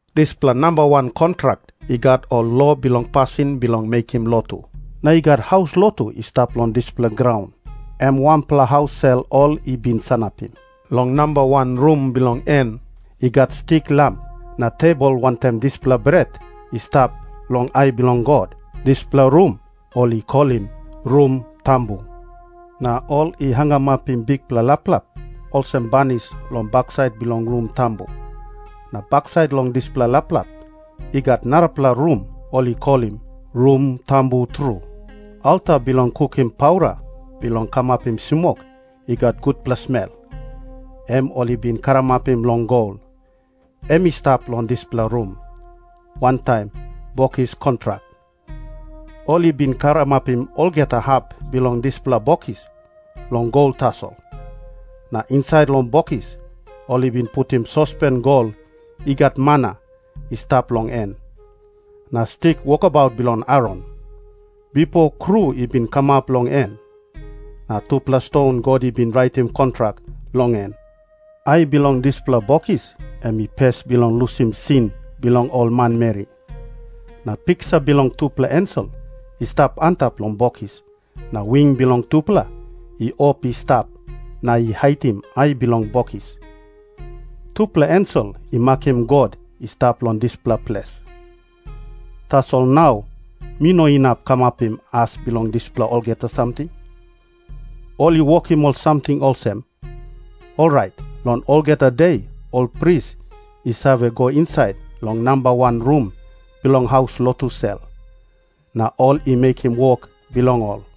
Dispela namba wan kontrak i gat ol lo bilong pasin bilong mekim lotu. Na i gat haus lotu i stap long dispela graun, em wanpela haus sel ol i bin sanapim. Long namba wan rum bilong en i gat stik lam na tebol wantaim dispela bret i stap long ai bilong God. Dispela rum ol i kolim “Rum Tambu”. Na ol i hangamapim bikpela laplap olsem banis long baksait bilong Rum Tambu, na baksait long dispela laplap i gat narapela rum ol i kolim “Rum Tambu Tru”. Alta bilong kukim paura bilong kamapim smok i gat gutpela smel, em ol i bin karamapim long gol, em i stap long dispela rum, wantaim Bokis Kontrak. Ol i bin karamapim olgeta hap bilong dispela bokis long gol tasol, na insait long bokis ol i bin putim sospen gol i gat mana i stap long en, na stik wokabaut bilong Aron, bipo kru i bin kamap long en, na tupela ston God i bin raitim kontrak long en. Ai bilong dispela bokis em i ples bilong lusim sin bilong ol manmeri. Na piksa bilong tupela ensel i stap antap long bokis na wing bilong tupela i op i stap na i haitim ai bilong bokis. Tupela ensel i makim God i stap long dispela ples. Tasol nau mi no inap kamapim as bilong dispela olgeta samting. Ol i wokim ol samting olsem, orait long olgeta de ol pris i save go insait long namba wan rum bilong haus lotu sel, na ol i mekim wok bilong ol.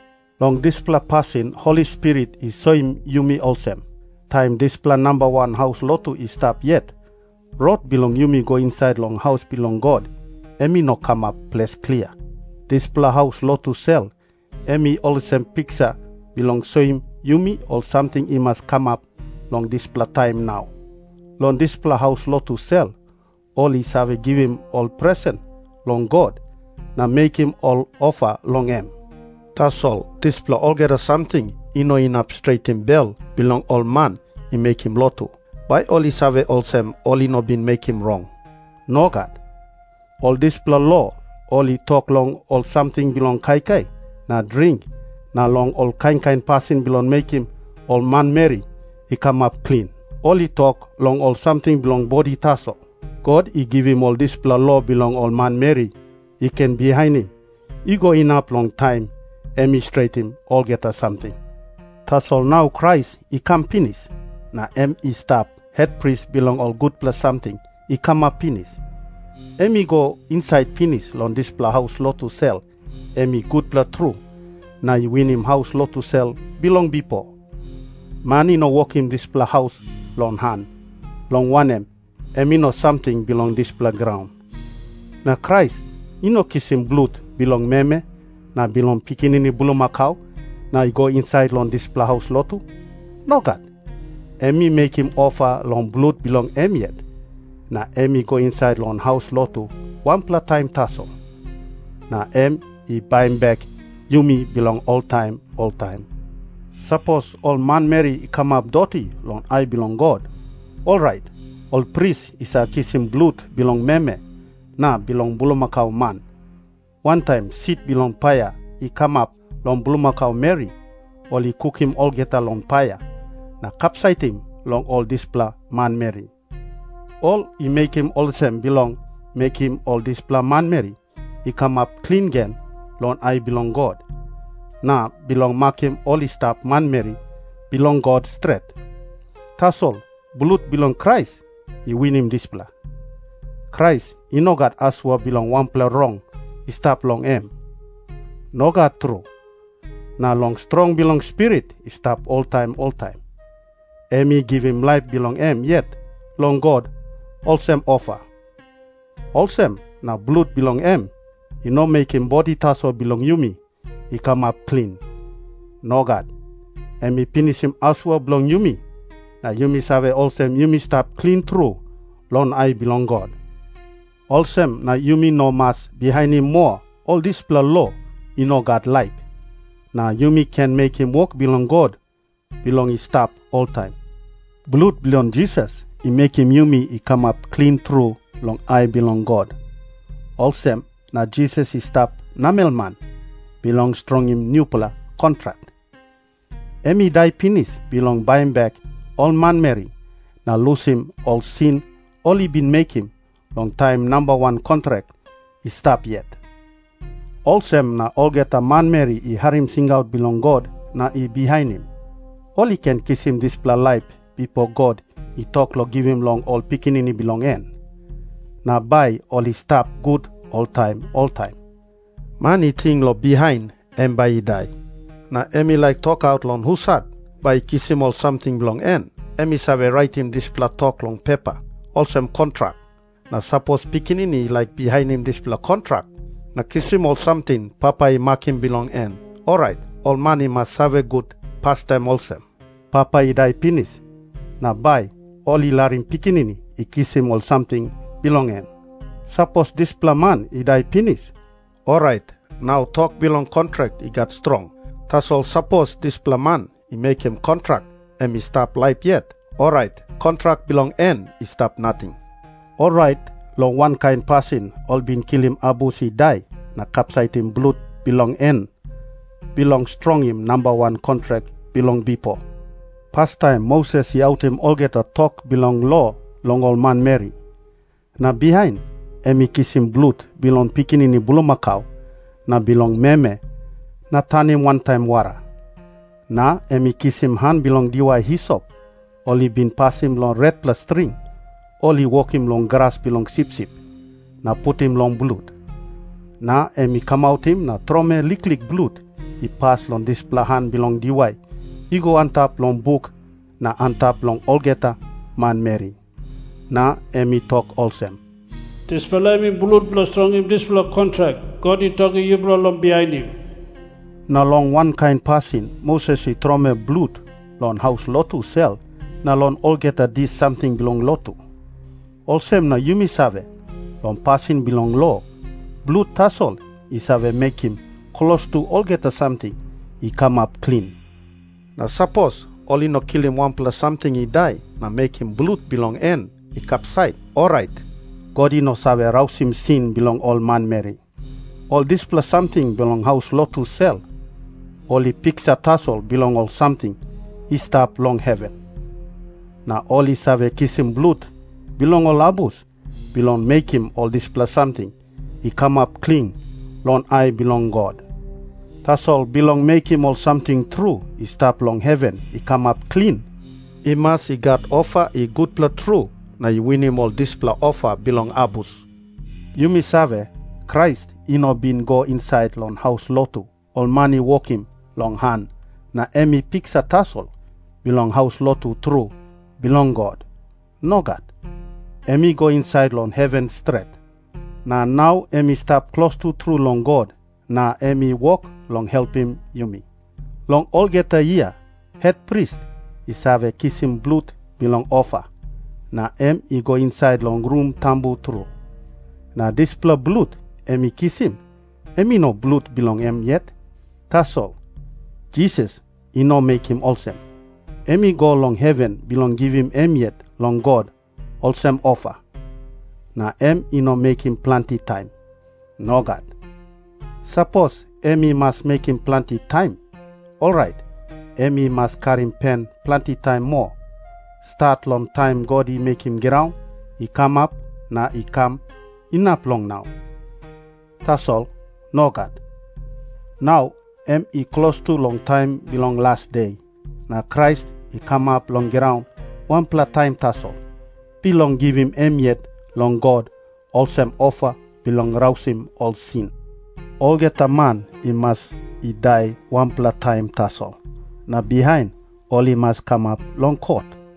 Long dispela pasin Holi Spirit i soim yumi olsem, taim dispela namba wan haus lotu i stap yet, rot bilong yumi go insait long haus bilong God, em i no kamap ples klia. Dispela haus lotu sel em i olsem piksa bilong soim yumi ol samting i mas kamap long dispela taim nau. Long dispela haus lotu sel, ol i save givim ol presen long God na mekim ol ofa long em. Tasol dispela olgeta samting i no inap stretim bel bilong ol man i mekim lotu, bai ol i save olsem ol i no bin mekim rong. Nogat. Ol dispela lo ol i tok long ol samting bilong kaikai na dring na long ol kain kain pasin bilong mekim ol manmeri i kamap klin. Ol i tok long ol samting bilong bodi tasol. God i givim ol dispela lo bilong ol manmeri i ken bihainim i go inap long taim em i stretim olgeta samting. Tasol nau Krais i kam pinis, na em i stap hetpris bilong ol gutpela samting i kamap pinis. Em i go insait pinis long dispela haus lotu sel em i gutpela tru na i winim haus lotu sel bilong bipo. Man i no wokim dispela haus long han, long wanem, em i no samting bilong dispela graun. Na Krais i no kisim blut bilong meme na bilong pikinini bulmakau na i go insait long dispela haus lotu. Nogat. Em i mekim ofa long blut bilong em yet, na em i go insait long haus lotu wanpela taim tasol. Na em i baim bek yumi bilong oltaim oltaim. Sapos ol manmeri i kamap doti long ai bilong God, orait ol pris i save kisim blut bilong meme na bilong bulmakau man, wantaim sit bilong paia i kamap long bulmakau meri ol i kukim olgeta long paia, na kapsaitim long ol dispela manmeri. Ol i mekim olsem bilong mekim ol dispela manmeri i kamap klin gen long ai bilong God, na bilong makim ol i stap manmeri bilong God stret. Tasol blut bilong Krais i winim dispela. Krais i no gat asua bilong wanpela rong i stap long em. Nogat tru. Na long strong bilong Spirit i stap oltaim oltaim, em i givim laip bilong em yet long God olsem ofa. Olsem na blut bilong em i no mekim bodi tasol bilong yumi i kamap klin. Nogat. Em i pinisim asua bilong yumi na yumi save olsem yumi stap klin tru long ai bilong God. Olsem na yumi no mas bihainim moa ol dispela lo i no gat laip, na yumi ken mekim wok bilong God bilong i stap oltaim. Blut bilong Jisas i mekim yumi i kamap klin tru long ai bilong God, olsem na Jisas i stap namelman bilong strongim nupela kontrak. Em i dai pinis bilong baim bek ol manmeri na lusim ol sin ol i bin mekim long taim namba wan kontrak i stap yet. Olsem na olgeta manmeri i harim singaut bilong God na i bihainim, ol i ken kisim dispela laip bipo God i tok long givim long ol pikinini bilong en. Na bai ol i stap gut oltaim oltaim. Man i ting long bihain em bai i dai, na em i laik tokaut long husat bai i kisim ol samting bilong en, em i save raitim dispela tok long pepa, olsem kontrak. Na sapos pikinini i laik bihainim dispela kontrak na kisim ol samting papa i makim bilong en, orait ol man i mas save gut pastaim olsem, papa i dai pinis, na bai ol i larim pikinini i kisim ol samting bilong en. Sapos dispela man i dai pinis, orait nau tok bilong kontrak i gat strong. Tasol sapos dispela man i mekim kontrak em i stap laip yet, orait kontrak bilong en i stap nating. Orait long wankain pasin ol i bin kilim abus i dai na kapsaitim blut bilong en bilong strongim namba wan kontrak bilong bipo. Pastaim Moses i autim olgeta tok bilong lo long ol manmeri. Na bihain em i kisim blut bilong pikinini bulmakau na bilong meme na tanim wantaim wara. Na em i kisim han bilong diwai hisop ol i bin pasim long retpela string ol i wokim long gras bilong sipsip, na putim long blut. Na em i kamautim na tromoi liklik blut i pas long dispela han bilong diwai i go antap long buk na antap long olgeta manmeri. Na em i tok olsem, “Dispela em i blut bilong strongim dispela kontrak God i tokim yupela long bihainim.” Na long wankain pasin Moses i tromoi blut long haus lotu sel na long olgeta dis samting bilong lotu. Olsem na yumi save, long pasin bilong lo blut tasol i save mekim klostu olgeta samting i kamap klin. Na sapos ol i no kilim wanpela samting i dai na mekim blut bilong en i kapsait, orait God i no save rausim sin bilong ol manmeri. Ol dispela samting bilong haus lotu sel, ol i piksa tasol bilong ol samting i stap long heven. Na ol i save kisim blut bilong ol abus bilong mekim ol dispela samting i kamap klin long ai bilong God. Tasol bilong mekim ol samting tru i stap long heven i kamap klin, i mas i gat ofa i gutpela tru na i winim ol dispela ofa bilong abus. Yumi save, Krais i no bin i go insait long haus lotu ol man i wokim long han na em i piksa tasol bilong haus lotu tru bilong God. Nogat. Em i go insait long heven stret. Na nau em i stap klostu tru long God, na em i wok long helpim yumi. Long olgeta yia hetpris i save kisim blut bilong ofa, na em i go insait long Rum Tambu Tru. Na dispela blut em i kisim, em i no blut bilong em yet. Tasol Jisas i no mekim olsem. Em i go long heven bilong givim em yet long God olsem ofa. Na em i no mekim planti taim. Nogat. Sapos em i mas mekim planti taim, orait em i mas karim pen planti taim moa, stat long taim God i mekim graun i kamap na i kam inap long nau. Tasol nogat. Nau em i klostu long taim bilong las de, na Krais i kamap long graun wanpela taim tasol, bilong givim em yet long God olsem ofa bilong rausim ol sin. Olgeta man i mas i dai wanpela taim tasol, na bihain ol i mas kamap long kot.